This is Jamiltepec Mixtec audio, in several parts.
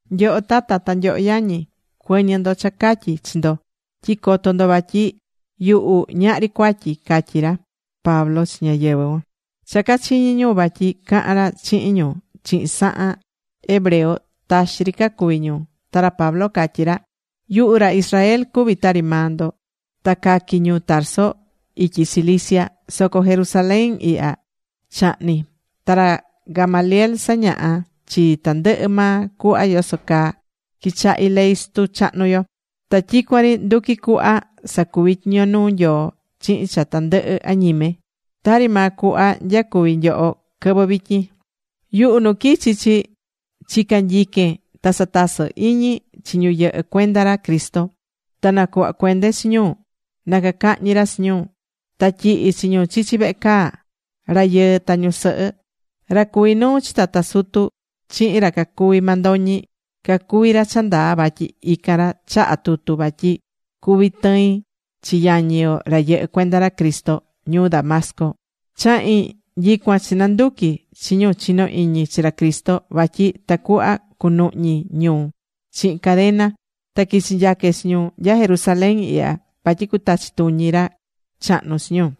―Nyoho tata, ta nyoho yañi, cuɨ̱ñɨ ndo cha catyí chi ndo tyi coto ndo vatyi yuhu ñahri cuatyi ―catyí ra Pablo chi ñáyɨvɨ cuan. Cha cachiñi̱ ñu vatyi cahán ra chihin ñu chihin sahan hebreo, taxi ri cacuvi̱ ñu. Ta ra Pablo catyí ra: ―Yuhu ra Israel cuví tari maa ndo. Ta caqui̱ ñuu Tarso ityi Cilicia. Soco Jerusalén ihya chahni̱. Ta ra Gamaliel sañaha chii tandɨhɨ maa cuhva yoso caa quichahi ley sutu chahnu yo. Ta tyicuan ri nduquí cuhva sacuví tyiño nuu Nyoo chihin cha tandɨhɨ añime, tari maa cuhva nyacuví nyoho quɨvɨ vityin. Yuhu, nu quichi chi chica̱ nyiquen ta satasɨ iñi chi ñu yɨhɨ́ cuenda ra Cristo. Ta nacuhva̱ cuende chi ñu na cacahñi ra chi ñu. Ta tyihí chi ñu chichi vehe caa, rayɨɨ ta ñusɨhɨ. Ra cuví nuu chi tata sutu chihin ra cacuví mandoñi, cacuví ra cha ndaa vatyi ican ra chaha̱ tutu vatyi cuvi tɨin chi yañi yo, ra yɨhɨ́ cuenda ra Cristo ñuu Damasco. Chahi̱n nyicuan chinanduqui̱ chi ñu chinó iñi chi ra Cristo, vatyi tacuhva cunuhñi ñu chihin cadena, ta quichi nyaque chi ñu nya Jerusalén ihya vatyi cutachi tuñi ra chahnu chi ñu.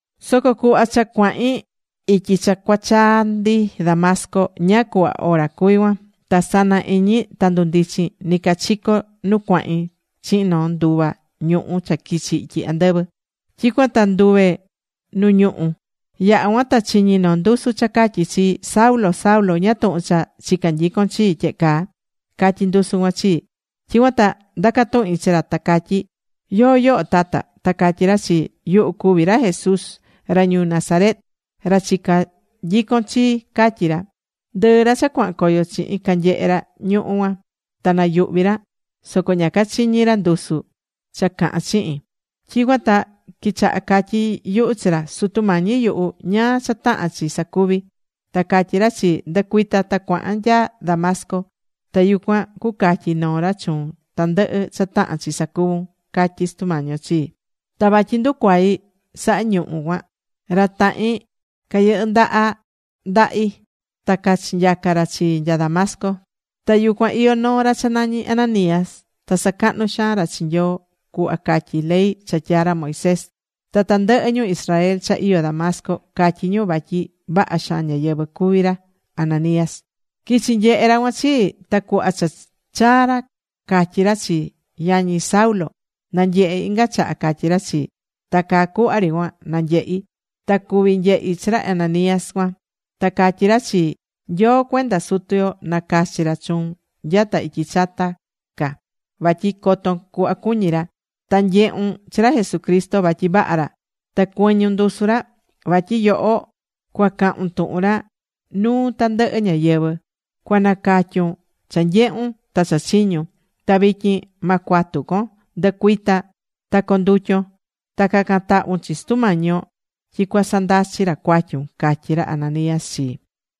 ’Soco cuhva cha cuahin ityi cha cuachaa ndi Damasco, ñáá cuhva ora cuví cuan. Ta sana iñi ta ndundichi̱n nɨcachico nu cuahin chihin noo nduva ñuhu cha quichi ityi andɨvɨ. Tyicuan ta nduve̱ nu ñuhú. Yaha̱ cuan ta chiñi̱ noo ndusu cha catyí chii: “Saulo, Saulo, ¿ñáá tuhun cha chicá nyicon chii tyehe caa?” catyí ndusu cuan chii. Tyicuan ta ndacá tuhin chi ra ta catyí: “¿Yóó yoho tata?” Ta catyí ra chii: “Yuhu cuví ra Jesús, ra ñuu Nazaret, ra chicá nyicon chi”, catyi ra. Ndɨɨ ra cha cuahan coyo chihin canyehe̱ ra ñuhu̱ cuan, ta nayuhvi̱ ra. Soco ña cachiñi̱ ra ndusu ra cha cahán chihin. Tyicuan ta quichahá catyí yuhu chi ra: “Sutu Mañi yuhu, ¿ñáá cha tahán chi sacuvi?” Ta catyí ra chii: “Ndɨ̱cuita ta cua̱han nya Damasco. Ta yucuan cucatyi noo ra chuun tandɨhɨ cha tahán chi sacuvun”, catyí Sutu Mañi yo chii. Ta vatyi nducuai̱ saha ñuhu̱ cuan, ra tahin cayɨndaha̱ ndahi ta cachinyaca̱ ra chii nya Damasco. ’Ta yucuan iyó noo ra cha nañí Ananías. Ta sacahnú xaan ra chi Nyoo cuhva catyí ley cha tyaa̱ ra Moisés. Ta tandɨhɨ ñu Israel cha iyó Damasco catyí ñu vatyi vaha xaan ñáyɨvɨ cuví ra Ananías. Quichi̱ nyehe̱ ra cuan chii. Ta cuhva cha chaa̱ ra, catyí ra chii: “Yañi Saulo, na̱nyehe inga chaha”, catyí ra chii. Ta caa cuhva ri cuan nanyehi̱. Ta cuví nyehi chi ra Ananías cuan. Ta catyí ra chii: “Nyoo cuenda sutu yo nacachi̱ ra chuun nyata ityi chata ca, vatyi coton cuhva cuñí ra, ta nyehun chi ra Jesucristo vatyi vaha ra, ta cuɨñun ndusu ra. Vatyi yoho cuacahun tuhun ra nuu tandɨhɨ ñáyɨvɨ. Cuanacatyun cha nyehu̱n ta cha chiñu̱n. Ta vityin, ma cuatu con. Ndɨ̱cuita ta co̱ndutyon. Ta ca̱can tahvun chi Sutu Mañi yo tyi cuasandachi ra cuatyun”, catyi̱ ra Ananías chii.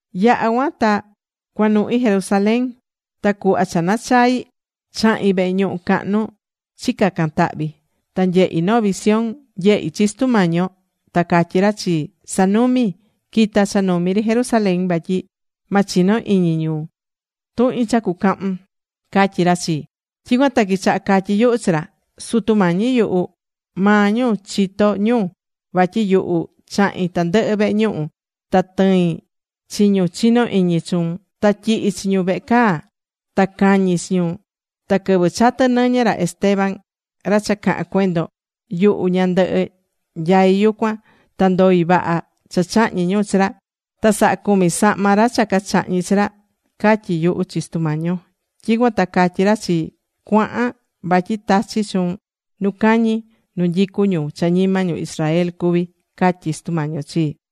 ’Yaha̱ cuan ta cuanuhin Jerusalén ta cuhva cha nachai̱, chahi̱n vehe ñuhu cahnu chicaca̱n tahvi. Ta nyehi̱ noo visión. Nyehi̱ chi Sutu Mañi yo. Ta catyí ra chii: “Sa̱numi. Qui̱ta cha numi ri Jerusalén vatyi ma chino iñi ñu tuhin cha cucahun”, catyí ra chii. Tyicuan ta quichaha catyí yuhu chi ra: “Sutu Mañi yuhu, maa ñu chitó ñu vatyi yuhu chahi̱n tandɨhɨ vehe ñuhu. Ta tɨi̱n chi ñu chinó iñi chuun, ta tyihi̱ chi ñu vehe caa ta cañi̱ chi ñu. Ta quɨvɨ chatɨ̱ nɨñɨ ra Esteban ra cha caha̱n cuendon, yuhu ñandɨhɨ nyaí yucuan. Ta ndoi̱ vaha cha chahñi̱ ñu chi ra. Ta sahacumi̱ sahma ra cha cachahñi̱ chi ra”, catyi̱ yuhu chi Sutu Mañi yo. Tyicuan ta catyi̱ ra chii: “Cua̱han, vatyi tachí chuun nu cañi, nu nyicu ñu cha ñima ñu Israel cuví”, catyí Sutu Mañi yo chii.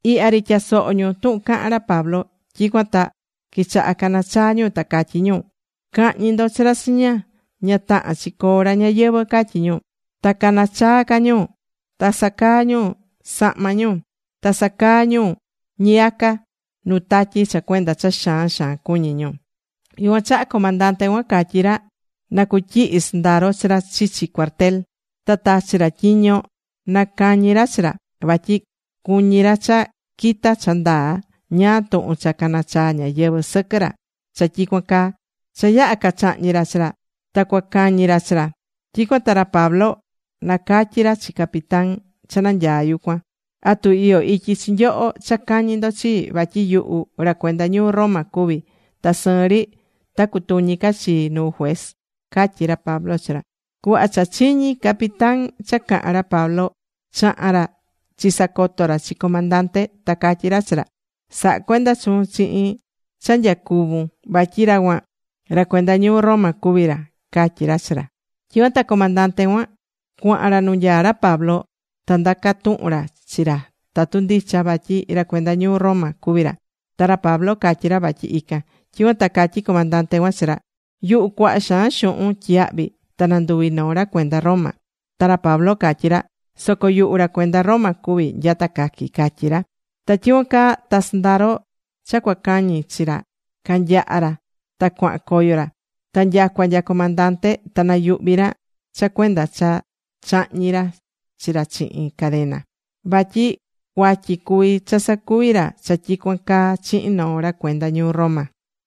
Ihya ri tyasohó ñu tuhun cahán ra Pablo. Tyicuan ta quichahá canachaá ñu ta catyí ñu: ―¡Ca̱hñi ndo chi ra chiña! Ña tahán chi coo ra ñayɨvɨ̱ ―catyí ñu. Ta canachaá ca ñu. Ta sacaá ñu sahma ñu. Ta sacaá ñu ñiyaca nu tatyi cha cuenda cha xaan xaan cuñí ñu. Yucuan chaha comandante cuan catyí ra na cutyihi sɨndaro chi ra chichi cuartel. Ta tachi̱ ra tyiño na cañi ra chi ra, vatyi cuñí ra cha quita cha ndaa ñáá tuhun cha canachaá ñáyɨvɨ sɨquɨ ra cha tyicuan caa. Soco cha yaha̱ cacháhñi̱ ra chi ra ta cuacañi ra chi ra, tyicuan ta ra Pablo nacatyí ra chi capitán cha nanyaá yucuan: ―¿Atu iyó ityi chi nyoho cha cañi ndo chii? Vatyi yuhu ra cuenda ñuu Roma cuví ta sɨɨn ri ta cutuñi ca chii nu juez ―catyí ra Pablo chi ra. Cuhva cha chiñi̱ capitán cha cahan ra Pablo, chaha̱n ra chisacoto̱ ra chi comandante. Ta catyí ra chi ra: ―Sa̱ha cuenda chuun chihin cha nyacuvún. Vatyi ra cuan, ra cuenda ñuu Roma cuví ra ―catyí ra chi ra. Tyicuan ta comandante cuan cuaha̱n ra nu nyaá ra Pablo. Ta ndacá tuhun ra chi ra tatu ndicha vatyi ra cuenda ñuu Roma cuví ra. Ta ra Pablo catyí ra vatyi ican. Tyicuan ta catyí comandante cuan chi ra: ―Yuhu cuaha xaan xuhun tyiyahvi̱ ta nanduvi̱ noo ra cuenda Roma. Ta ra Pablo catyí ra: ―Soco yuhu ra cuenda Roma cuví nyata caqui̱ ―catyí ra. Ta tyicuan caa ta sɨndaro cha cuacañi chi ra canyaha̱ ra ta cuaha̱n coyo ra. Ta nyacua nya comandante ta nayuhvi̱ ra cha cuenda cha cháhñi̱ ra chi ra chihin cadena. [Vatyi cuatyi cuví cha sacuví ra cha tyicuan caa chihin noo ra cuenda ñuu Roma.]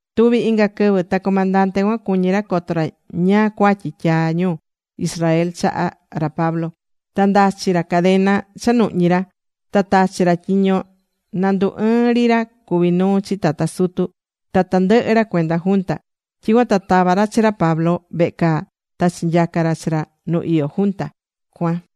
Tuvi̱ inga quɨvɨ ta comandante cuan cuñí ra coto ra ñáá cuatyi tyaá ñu Israel chaha ra Pablo. Ta ndachí ra cadena cha nuhñí ra. Ta tachi̱ ra tyiño na ndu ɨɨn ri ra cuví nuu chi tata sutu, ta tandɨhɨ ra cuenda junta. Tyicuan ta tava̱ ra chi ra Pablo vehe caa ta chinyaca̱ ra chi ra nu iyó junta cuan.